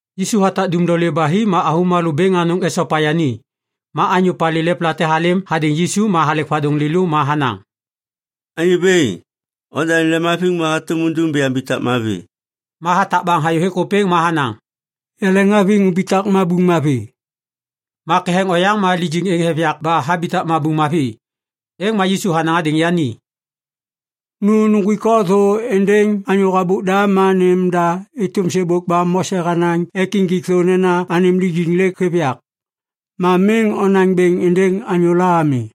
Yisu hatak dumlolê ba hi ma avômalô bêŋ anôŋ esopa yani. Ma anyô palê lepla te halêm hadêŋ Yisu ma halek vadôŋ lêlô ma hanaŋ, “Anyô bêŋ, odanêm lemhaviŋ ma hatôm undum ba yambitak mavi.” Ma hatak baŋ hayô hêk ôpêŋ ma hanaŋ, “Yaleŋhaviŋ umbitak mabuŋ mavi!” Ma ketheŋ oyaŋ ma lijiŋ êŋ hêv yak ba habitak mabuŋ mavi. Êŋ ma Yisu hanaŋ hadêŋ yani, “Nu nuŋgwik o thô êndêŋ anyô habôk da ma nêm da êtôm sêbôk ba Mose hanaŋ ek injik thô nena anêm lijiŋ lêk hêv yak. Ma miŋ onaŋ bêŋ êndêŋ anyôla ami.”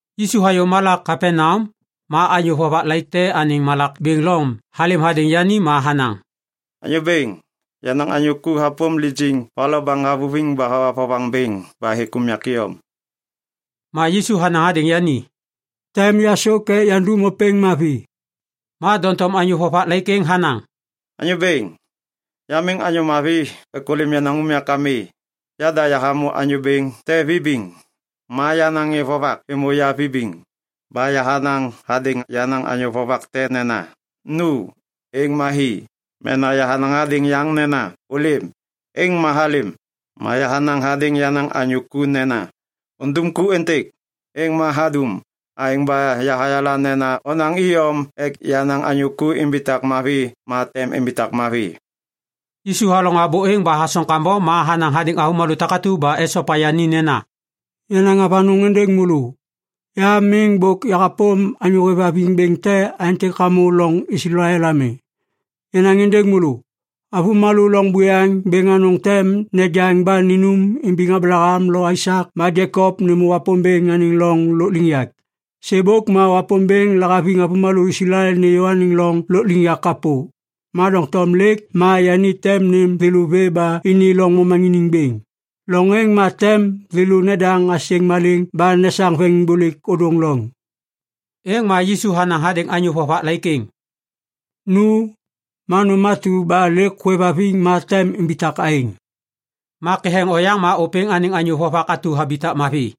Yisu hayô malak Kapaneam, ma anyô vovak laik te anêŋ malak bêŋ Lom halêm hadêŋ yani ma hanaŋ, “Anyô bêŋ, yenaŋ anyô ku hapôm lijiŋ va lo baŋ havuviŋ ba hawa vovaŋ bêŋ ba hêk unyak iyom.” Ma Yisu hanaŋ hadêŋ yani, “Tem yasôk ek yandum ôpêŋ mavi.” Ma doŋtom anyô vovak laik êŋ hanaŋ, “Anyô bêŋ, ya miŋ anyô mavi ek ôlêm yenaŋ unyak ami. Yada yahamô anyô bêŋ te vibiŋ, ma yenaŋ ŋê vovak êmô ya vibiŋ. Ba yahanaŋ hadêŋ yenaŋ anyô vovak te nena, ‘Nu,’ êŋ ma hi. Mena yahanaŋ hadêŋ yaŋ nena, ‘Ôlêm,’ êŋ ma halêm. Ma yahanaŋ hadêŋ yenaŋ anyô ku nena, ‘Undum ku êntêk,’ êŋ ma hadum. Aêŋ ba yahayala nena onaŋ iyom ek yenaŋ anyô ku imbitak mavi ma tem imbitak mavi.” Yisu halaŋô abô êŋ ba hasoŋ kambom ma hanaŋ hadêŋ avômalô takatu ba esopa yani nena, “Yanaŋ avanôŋ êndêŋ môlô. Ya miŋ bôk yahapôm anyô hêvhaviŋ bêŋ te aêntêk hamô loŋ Islael ami. Yanaŋ êndêŋ môlô. Avômalô loŋ buyaŋ bêŋ anôŋ tem nejaŋ ba ninum imbiŋ Ablaham lo Aisak ma Jekop nêmô Wapômbêŋ anêŋ loŋ lôkliŋyak. Sêbôk ma Wapômbêŋ lahaviŋ avômalô Islael nêyô anêŋ loŋ lôkliŋyak kapô, ma doŋtom lêk ma yani tem nêm thêlô vê ba ini loŋ momaŋiniŋ bêŋ. Loŋ êŋ ma tem thêlô nedaŋ asêŋ maleŋ ba nesaŋ veŋiŋbôlêk ôdôŋ loŋ.” Êŋ ma Yisu hanaŋ hadêŋ anyô vovak laik êŋ, “Nu! Ma nôm atu ba lêk hôêvhaviŋ ma tem imbitak aêŋ.” Ma ketheŋ oyaŋ ma ôpêŋ anêŋ anyô vovak atu habitak mavi.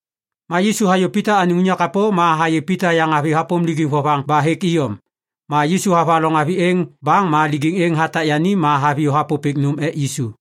Ma Yisu hayô Pita anêŋ unyak kapô ma hayê Pita yaŋavi hapôm lijiŋ vovaŋ ba hêk iyom. Ma Yisu havaloŋ avi êŋ baŋ ma lijiŋ êŋ hatak yani ma haviyô hapôpêk nôm ek Yisu.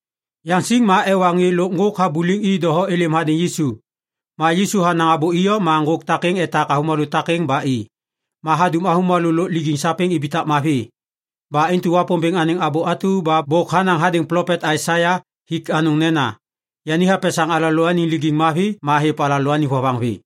Yaŋsiŋ ma ewa ŋê lôk ŋgôk habuliŋ i doho êlêm hadêŋ Yisu. Ma Yisu hanaŋ abô iyom ma ŋgôk takêŋ etak avômalô takêŋ ba i. Ma hadum avômalô lôk lijiŋ sapêŋ ibitak mavi. Ba intu Wapômbêŋ anêŋ abô atu ba bôk hanaŋ hadêŋ plopet Aisaia hik anôŋ nena, “Yani hapesaŋ alalôaniŋ lijiŋ mavi ma hêv alalôaniŋ vovaŋ vê.”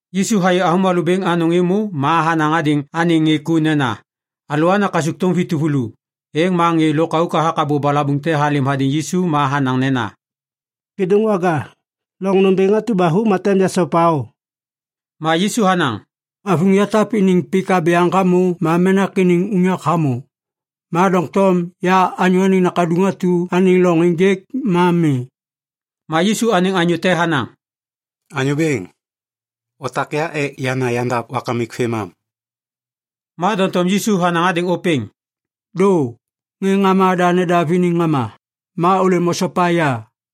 Yisu hayê avômalô bêŋ anôŋ êmô ma hanaŋ hadêŋ anêŋ ŋê ku nena, “Alôana kasukthôm vi tuvulu.” Êŋ ma ŋê lôkauk hathak abô balabuŋ te halêm hadêŋ Yisu ma hanaŋ nena, “Kêdôŋwaga, loŋ nômbêŋ atu ba hu ma tem yasopa o.” Ma Yisu hanaŋ, “Avuŋ yatap iniŋ pik abyaŋ hamô ma menak iniŋ unyak hamô, ma doŋtom ya Anyô Anêŋ Nakaduŋ atu anêŋ loŋ ênjêk ma mi.” Ma Yisu anêŋ anyô te hanaŋ, “Anyô Bêŋ, otak ya ek yana yandav wakamik vêmam.” Ma doŋtom Yisu hanaŋ hadêŋ ôpêŋ, “Dô! Ŋê ŋama da nedav iniŋ ŋama. Ma ôlêm osopa ya!”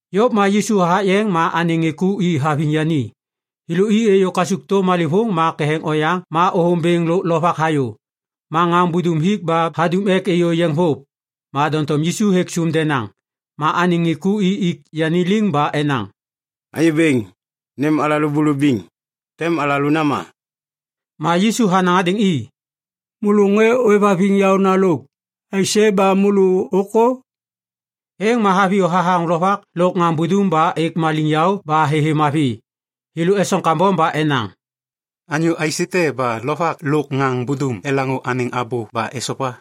Yôv ma Yisu hathak yeŋ ma anêŋ ŋê ku i haviŋ yani. Thêlô i êyô kasukthôm malêvôŋ ma ketheŋ oyaŋ ma ôthôm bêŋ lôk lovak hayô. Ma ŋaŋ budum hik ba hadum ek êyô yeŋ vôv. Ma doŋtom Yisu hêk sôm denaŋ. Ma anêŋ ŋê ku i ik yani liŋ ba enaŋ, “Anyô Bêŋ, nêm alalô bulubiŋ! Tem alalô nama!” Ma Yisu hanaŋ hadêŋ i, “Môlô ŋê ôêvhaviŋ yaôna lôk! Aisê ba môlô ôkô?” Êŋ ma haviyô hathaŋ lovak lôk ŋaŋ budum ba êk maliŋyaô ba thêthê mavi. Thêlô esoŋ kambom ba enaŋ, “Anyô aisête ba lovak lôk ŋaŋ budum elaŋô anêŋ abô ba esopa?”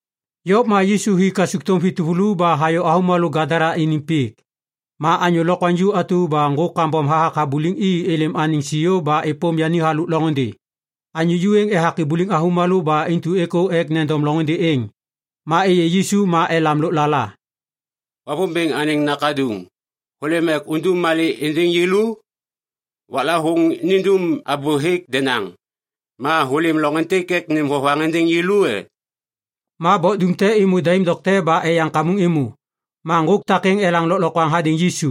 Yôv ma Yisu hi kasukthôm vi tuvulu ba hayô avômalô Gadala iniŋ pik. Ma anyô lokwaŋju atu ba ŋgôk kambom hathak habuliŋ i êlêm anêŋ siô ba êpôm yani halôk loŋôndê. Anyô ju êŋ ethak ibuliŋ avômalô ba intu êkô ek nendom loŋôndê êŋ. Ma êyê Yisu ma elam lôklala, “Wapômbêŋ anêŋ Nakaduŋ, hôlêm ek undum malê êndêŋ yêlô? Waklavôŋ nindum abô hêk denaŋ. Ma hôlêm loŋ êntêk ek nêm vovaŋ êndêŋ yêlô e?” Ma bok dum te êmô daim dokte ba eyaŋ kamuŋ êmô. Ma ŋgôk takêŋ elaŋ lôklokwaŋ hadêŋ Yisu,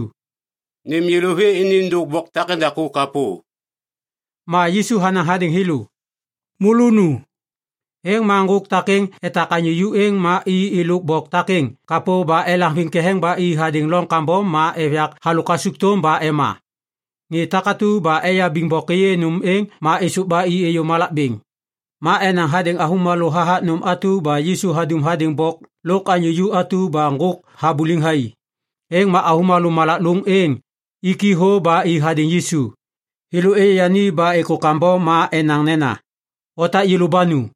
“Nêm yêlô vê ni êndôk bok takêŋdaku kapô.” Ma Yisu hanaŋ hadêŋ thêlô “Môlô nu!” Êŋ ma ŋgôk takêŋ etak anyô ju êŋ ma i êlôk bok takêŋ kapô ba elaŋviŋ ketheŋ ba i hadêŋ loŋ kambom ma êv yak halôk kasukthôm ba ema. Ŋê takatu ba eyabiŋ bok êyê nôm êŋ ma êsôv ba i êyô malak bêŋ. Ma enaŋ hadêŋ avômalô hathak nôm atu ba Yisu hadum hadêŋ bok lôk anyô ju atu ba ŋgôk habuliŋ thai. Êŋ ma avômalô malak lôŋ êŋ iki thô ba i hadêŋ Yisu. Thêlô êyê yani ba êkô kambom ma enaŋ nena, “Otak yêlô ba nu!”